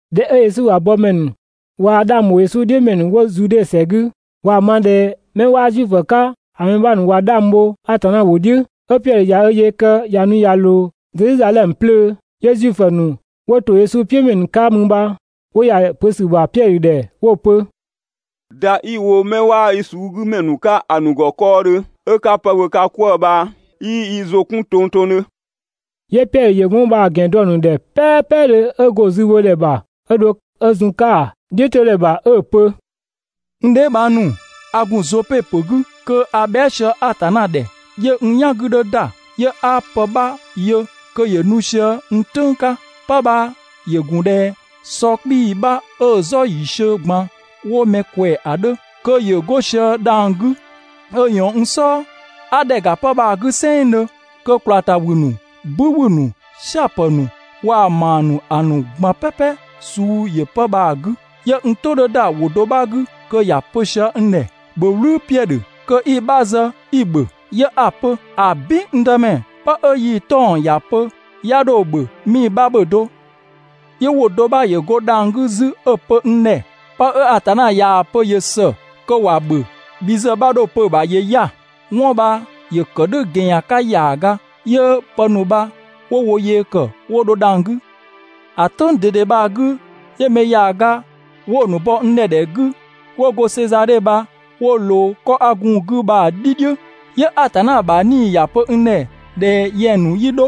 ꞊Dhɛ 'ö Yesu ‑bha yëkëmɛ ‑nu waa‑ 'dhang ‑bho "dhiʋ̈ ‑mɛ ‑nu 'wo Zude ‑sɛ 'gü ꞊waa‑ ma ꞊dhɛ 'mɛ 'waa Zuifö 'ka ‑a mɛ 'bha ‑nu ꞊wa 'dhang bho Atanna ‑wʋ "dhiʋ̈, 'ö Piɛdhö ꞊ya ö yee kë ꞊ya nu ꞊ya ꞊loo Zedhizadhɛmö 'plöö, 'yö Zuifö ‑nu 'wo ‑to Yesu Klisi "piʋ̈ ‑mɛ ‑nu 'ka mü bha 'wo ‑ya ‑a pö ‑sü ‑bha Piɛdhö ‑dhɛ 'wo‑ pö: «‑Da 'i‑ wo 'mɛ 'waa yi suu 'gü ‑mɛ ‑nu 'ka ‑a ‑nu ‑gɔ 'kɔɔdhö 'ö 'ka pë ‑bhö ka 'kwëë‑ bha 'yii yi ‑zʋ 'kun tongtongdhö!» 'Yö Piɛdhö ‑yö 'wɔn bha‑ ‑gɛn dɔ‑ ‑nu ‑dhɛ "pɛɛpɛdhö 'ö go‑ zübhodhɛ ‑bha 'ö dho 'ö zun‑ 'ka‑ "dhiʋ̈todhɛ ‑bha 'ö‑ pö: «N dheebhang ‑nu, a ‑gun Zope ‑pö 'gü kö a bhɛa" sië Atanna ‑dhɛ, 'yö n "yan 'gü 'dhö ‑da, 'yö 'a pë 'bha yö kö ‑yö nu sië n "tʋ̈ng 'ka, 'pë bha ‑yö ‑gun ꞊dhɛ sɔ 'kpii‑ bha 'ö‑ "zɔ ‑yiisiö ꞊gban 'wo mɛ ꞊kwɛɛ‑ ‑a 'dhö kö ‑yö 'go sië dhang‑ 'gü 'ö ꞊yɔɔn n "sɔɔ. 'A ‑dhɛ ‑ga 'pë bha‑ 'gü "sɛnngdhö, kö ꞊kwlaa ‑ta ‑wü ‑nu, "bü ‑wü ‑nu, "siapë ‑nu waa‑ ‑maa ‑nu ‑a ‑nu ꞊gban "pɛpɛ suu ‑yö 'pë bha‑ 'gü. 'Yö n "tʋ 'dhö ‑da ‑wʋ do 'bha 'gü kö ‑ya pö sië n ‑dhɛ: «‑Bhö "wlü, Piɛdhö, kö 'i‑ 'bha zë 'i‑ ‑bhö!» 'Yö 'a‑ pö: «‑Abin, n Dëmɛ, 'pë 'ö yii‑ 'tɔng‑ ‑ya pö 'ya 'dho‑ ‑bhö 'mii‑ 'bha ‑bhö do!» 'Yö ‑wʋ do 'bha ‑yö go dhang‑ 'gü 'zü 'ö‑ pö n ‑dhɛ: «'Pë 'ö Atanna ꞊yaa‑ pö ‑yö ‑së kö ‑wa ‑bhö, bhi ‑zë 'bha 'dho‑ pö‑ ‑bha ‑yö 'ya‑!» 'Wɔn bha ‑yö ‑kë "dhʋ̈ ‑gɛnyan 'ka ‑yaaga, 'yö pë ‑nu bha 'wo wo yee ‑kë 'wo dho dhang‑ 'gü. ‑A "tʋ̈ng ꞊dede bha‑ 'gü, 'yö mɛ ‑yaaga 'wo‑ ‑nu bɔ n ‑dhɛ ‑dhɛ 'gü 'wo go Sezadhe bha 'wo ꞊loo 'kɔ 'a gun‑ 'gü bha‑ "dhi "dhiʋ̈. 'Yö Atanna ‑bha 'Nii‑ ‑ya pö n ‑dhɛ ꞊dhɛ yɛng ‑nu 'yi 'dho,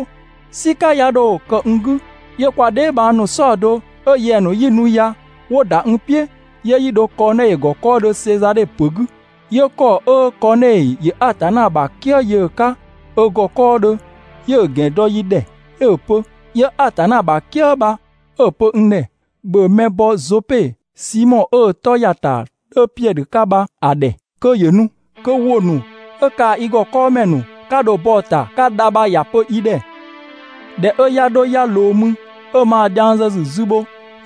"sika 'ya 'dho kë n 'gü. 'Yö kwa dheebhang ‑nu "saɔdo 'ö yɛng‑ ‑nu 'yi nu ya 'wo ‑da n "piʋ̈, 'yö 'yi dho Kɔɔnɛi ‑gɔ 'kɔɔdhö Sezadhe ‑pö 'gü. 'Yö ‑kɔ 'ö Kɔɔnɛi ‑yö Atanna ‑bha "kië yö‑ 'ka ö ‑gɔ 'kɔɔdhö, 'yö‑ ‑gɛn dɔ yi ‑dhɛ 'ö‑ pö. 'Yö Atanna ‑bha "kië bha 'ö‑ pö n ‑dhɛ: «‑Bhö mɛ bɔ Zope, Simɔ 'ö‑ 'tɔ ‑ya ‑ta 'dhö Piɛdhö 'ka bha‑ ‑dhɛ kö ‑yö nu! Kö ‑wʋ ‑nu 'ö kaa‑ i ‑gɔ 'kɔɔmɛ ‑nu 'ka dho bɔ‑ ‑ta 'ka dha bha ‑ya pö i ‑dhɛ!» ꞊Dhɛ 'ö 'ya 'dho 'ya ꞊loo mü, 'ö 'ma dhiang zë ‑sü zü bho,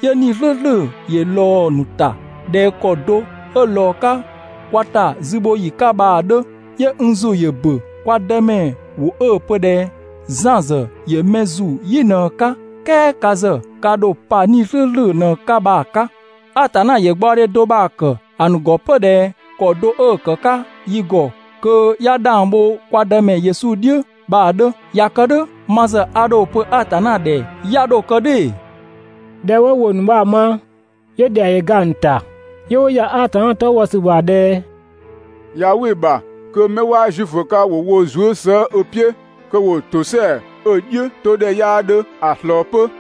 'yö 'Nii‑ "slʋ̈ʋ̈slʋ̈ ‑yö ꞊lɔɔ‑ ‑nu ‑ta ꞊dhɛ ‑kɔ do 'ö ꞊lɔɔ‑ 'ka kwa ‑ta zübhoyi 'ka bha‑ 'dhö. 'Yö n ‑zʋ ‑yö ‑bö kwa Dëmɛ ‑wʋ 'ö‑ pö ꞊dhɛ: «Zan ‑zë ‑yö mɛ ‑zu "yi ꞊në‑ 'ka, "kɛɛ ka ‑zë ka ‑dho pa 'Nii‑ "slʋ̈ʋ̈slʋ̈ ꞊në‑ 'ka bha‑ 'ka. Atanna ‑yö gbaɔdhe do bha‑ ‑kë ‑a ‑nu ‑gɔ 'pö ꞊dhɛ ‑kɔ do 'ö‑ ‑kë 'ka yi ‑gɔ kö 'ya 'dhang bho kwa Dëmɛ Yesu Klisi "dhiʋ̈ bha‑ 'dhö. ꞊Ya kë "dhʋ̈ ma ‑zë a ‑dho pö Atanna ‑dhɛ 'ya 'dho kë "dhʋ̈ ‑ee?» ꞊Dhɛ 'wo ‑wʋ ‑nu bha‑ ma, 'yö ‑dhɛa ‑yö ga‑ ‑nu ‑ta, 'yö 'wo ‑ya Atanna 'tɔ bhɔ ‑sü ‑bha ꞊dhɛ: «꞊Ya "wɩ‑ ‑bha kö 'mɛ 'waa Zuifö 'ka ‑wo wo zuë" slëë‑ ö "piʋ̈, kö ‑wo ‑tosɛa 'ö‑ "dhiʋ̈todhɛ 'yaa 'dhö ‑a ꞊slɔɔ 'pö.»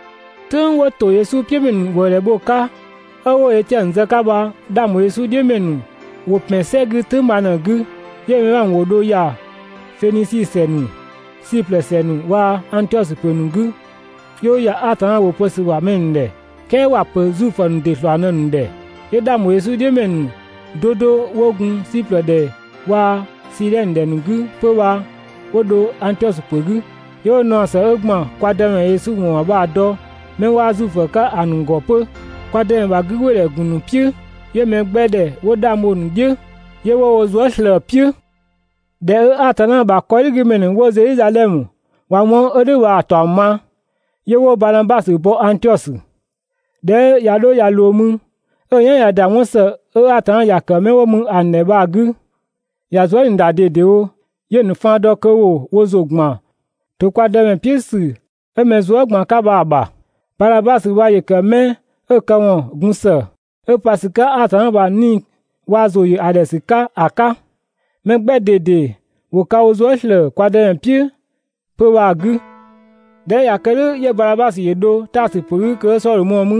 "Tʋ̈ng 'wo ‑to Yesu "piʋ̈ ‑mɛ ‑nu ‑wëëdhɛ bho‑ 'ka, 'ö 'wo Etiɛnö zë‑ 'ka bha 'dhang ‑bho Yesu "dhiʋ̈ ‑mɛ ‑nu ‑wo ‑pɛn "sɛ 'gü "tʋ̈ng bha ꞊në‑ 'gü, 'yö‑ mɛ 'bha ‑nu ‑wo dho ‑ya Fenisi ‑sɛ ‑nu, Siplë ‑sɛ ‑nu waa‑ Angtiɔsö ‑pö ‑nu 'gü, 'yö 'wo ‑ya Atanna ‑wʋ pö ‑sü ‑bha mɛ ‑nu ‑dhɛ, "kɛɛ ‑wa ‑pö Zuifö ‑nu ‑dɩ ‑slɔɔ ꞊në‑ ‑nu ‑dhɛ. 'Yö 'dhang ‑bho Yesu "dhiʋ̈ ‑mɛ ‑nu 'do 'do 'wo gun Siplë ‑dhɛ waa‑ Sidhɛnö ‑dhɛ ‑nu 'gü 'pö bha 'wo dho Angtiɔsö ‑pö 'gü, 'yö 'wo naɔ ‑së 'ö ‑gban kwa Dëmɛ Yesu ‑wɔn ‑bha bha‑ dɔ 'mɛ 'waa Zuifö 'ka ‑a ‑nu ‑gɔ 'pö. Kwa Dëmɛ ‑bha 'gügbɩɩdhɛ ‑gun ‑nu "piʋ̈, 'yö mɛ 'gbɛ ‑dhɛ 'wo 'dhang bho‑ "dhiʋ̈, 'yö 'wo wo zuë" ꞊slëë‑ "piʋ̈. ꞊Dhɛ 'ö Atanna ‑bha 'kɔdhigümɛ ‑nu 'wo Zedhizadhɛmö ꞊wa 'wɔn 'ö "dhʋ̈ bha‑ ‑taɔng ma, 'yö 'wo Banabasö bɔ Angtiɔsö. ꞊Dhɛ 'ö ꞊ya 'dho ꞊ya ꞊loo mü, 'ö‑ "yan ꞊ya ‑da 'wɔn ‑së 'ö Atanna ‑ya ‑kë 'mɛ 'wo mü ‑a ‑nu ‑dhɛ bha‑ 'gü, ‑ya zuë" ꞊nii ‑da ꞊dedewo. 'Yö‑ ‑nu faan dɔ kö ‑wo wo ‑zʋ ‑gban ‑to kwa Dëmɛ "piʋ̈ ‑sü 'ö mɛ zuë" ꞊gban 'ka bha‑ ‑bha. Banabasö bha ‑yö ‑kë 'mɛ 'ö‑ këwɔn gun ‑së, 'ö pa ‑sü 'ka Atanna ‑bha 'Nii‑ waa‑ ‑zʋ ‑yö ‑a ‑dhɛ ‑sü 'ka ‑a 'ka. Mɛ 'gbɛ ꞊dede ‑wo ka wo zuë" ‑slëë kwa Dëmɛ "piʋ̈ 'pö‑ bha‑ 'gü. ꞊Dhɛ 'ö ꞊ya kë "dhʋ̈, 'yö Banabasö ‑yö dho Taasö ‑pö 'gü kö 'ö Sɔdhö mɔɔ‑ mü.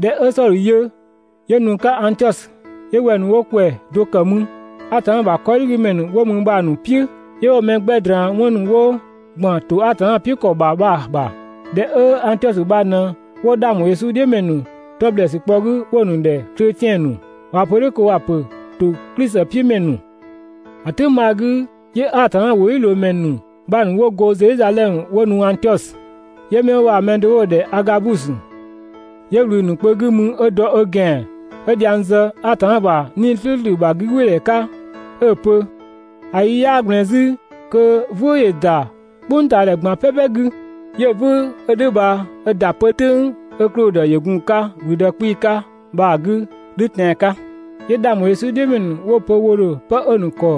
꞊Dhɛ 'ö Sɔdhö yö, 'yö nu‑ 'ka Angtiɔsö 'yö wɛng 'wo ‑kwɛ do ‑kë mü Atanna ‑bha 'kɔdhigümɛ ‑nu 'wo mü bha‑ ‑nu "piʋ̈, 'yö 'wo‑ mɛ 'gbɛ ꞊draan 'wɔn ‑nu 'wo ‑gban ‑to Atanna "piʋ̈ ‑kɔ ‑bha bha‑ ‑bha. ‑Dhɛ 'ö Angtiɔsö bha ꞊në 'wo 'dhang ‑bho Yesu "dhiʋ̈ ‑mɛ ‑nu 'tɔ ‑blɛɛsü kpɔ‑ 'gü 'wo‑ ‑nu ‑dhɛ «kletiɛn ‑nu» (꞊waa‑ pö "dhʋ̈ kö ‑wa ‑pö ‑to Klisi "piʋ̈ ‑mɛ ‑nu). ‑A "tʋ̈ng bha‑ 'gü 'yö Atanna ‑wʋdhiʋ̈loomɛ ‑nu 'bha ‑nu 'wo go Zedhizadhɛmö 'wo nu Angtiɔsö. 'Yö 'mɛ 'wo bha‑ mɛ do 'wo‑ ‑dhɛ Agabusö, 'yö ꞊wlü‑ ‑nu kpö 'gü mü 'ö dɔ ö ‑gɛan 'ö dhiang zë Atanna ‑bha 'Nii‑ "slʋ̈ʋ̈slʋ̈ ‑bha 'gügbɩɩdhɛ 'ka 'ö‑ pö: «‑A yi 'yaa ꞊gblɛɛn 'zü kö "vʋ̈ʋ̈‑ ‑da "kpʋngtaadhɛ ꞊gban "pɛpɛ 'gü.» ('Yö‑ "vʋ̈ʋ̈ 'ö "dhʋ̈ bha 'ö ‑da 'pö "tʋ̈ng 'ö Klodö ‑yö gun‑ 'ka ‑gblüdë 'kpii‑ 'ka bha‑ 'gü "dhʋ̈ tɛan‑ 'ka.) 'Yö 'dhang ‑bho Yesu "dhiʋ̈ ‑mɛ ‑nu 'wo‑ pö wo ‑dho 'pë 'ö‑ ‑nu ‑kɔ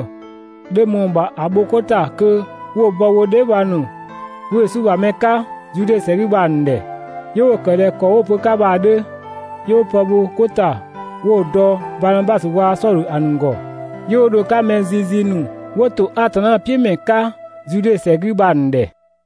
dho ꞊mɔɔ‑ ‑bha ‑a bho 'ko ‑ta kö 'wo‑ bɔ wo dheebhang ‑nu 'wo Yesu ‑bha mɛ 'ka Zude ‑sɛ 'gü bha‑ ‑nu ‑dhɛ. 'Yö 'wo‑ ‑kë ꞊dhɛ ‑kɔ 'wo‑ pö‑ 'ka bha‑ 'dhö, 'yö 'wo pë bho 'ko ‑ta 'wo‑ dɔ Banabasö waa‑ Sɔdhö ‑a ‑nu ‑gɔ, 'yö 'wo dho‑ 'ka mɛ zizi ‑nu 'wo ‑to Atanna "piʋ̈ ‑mɛ 'ka Zude ‑sɛ 'gü bha‑ ‑nu ‑dhɛ.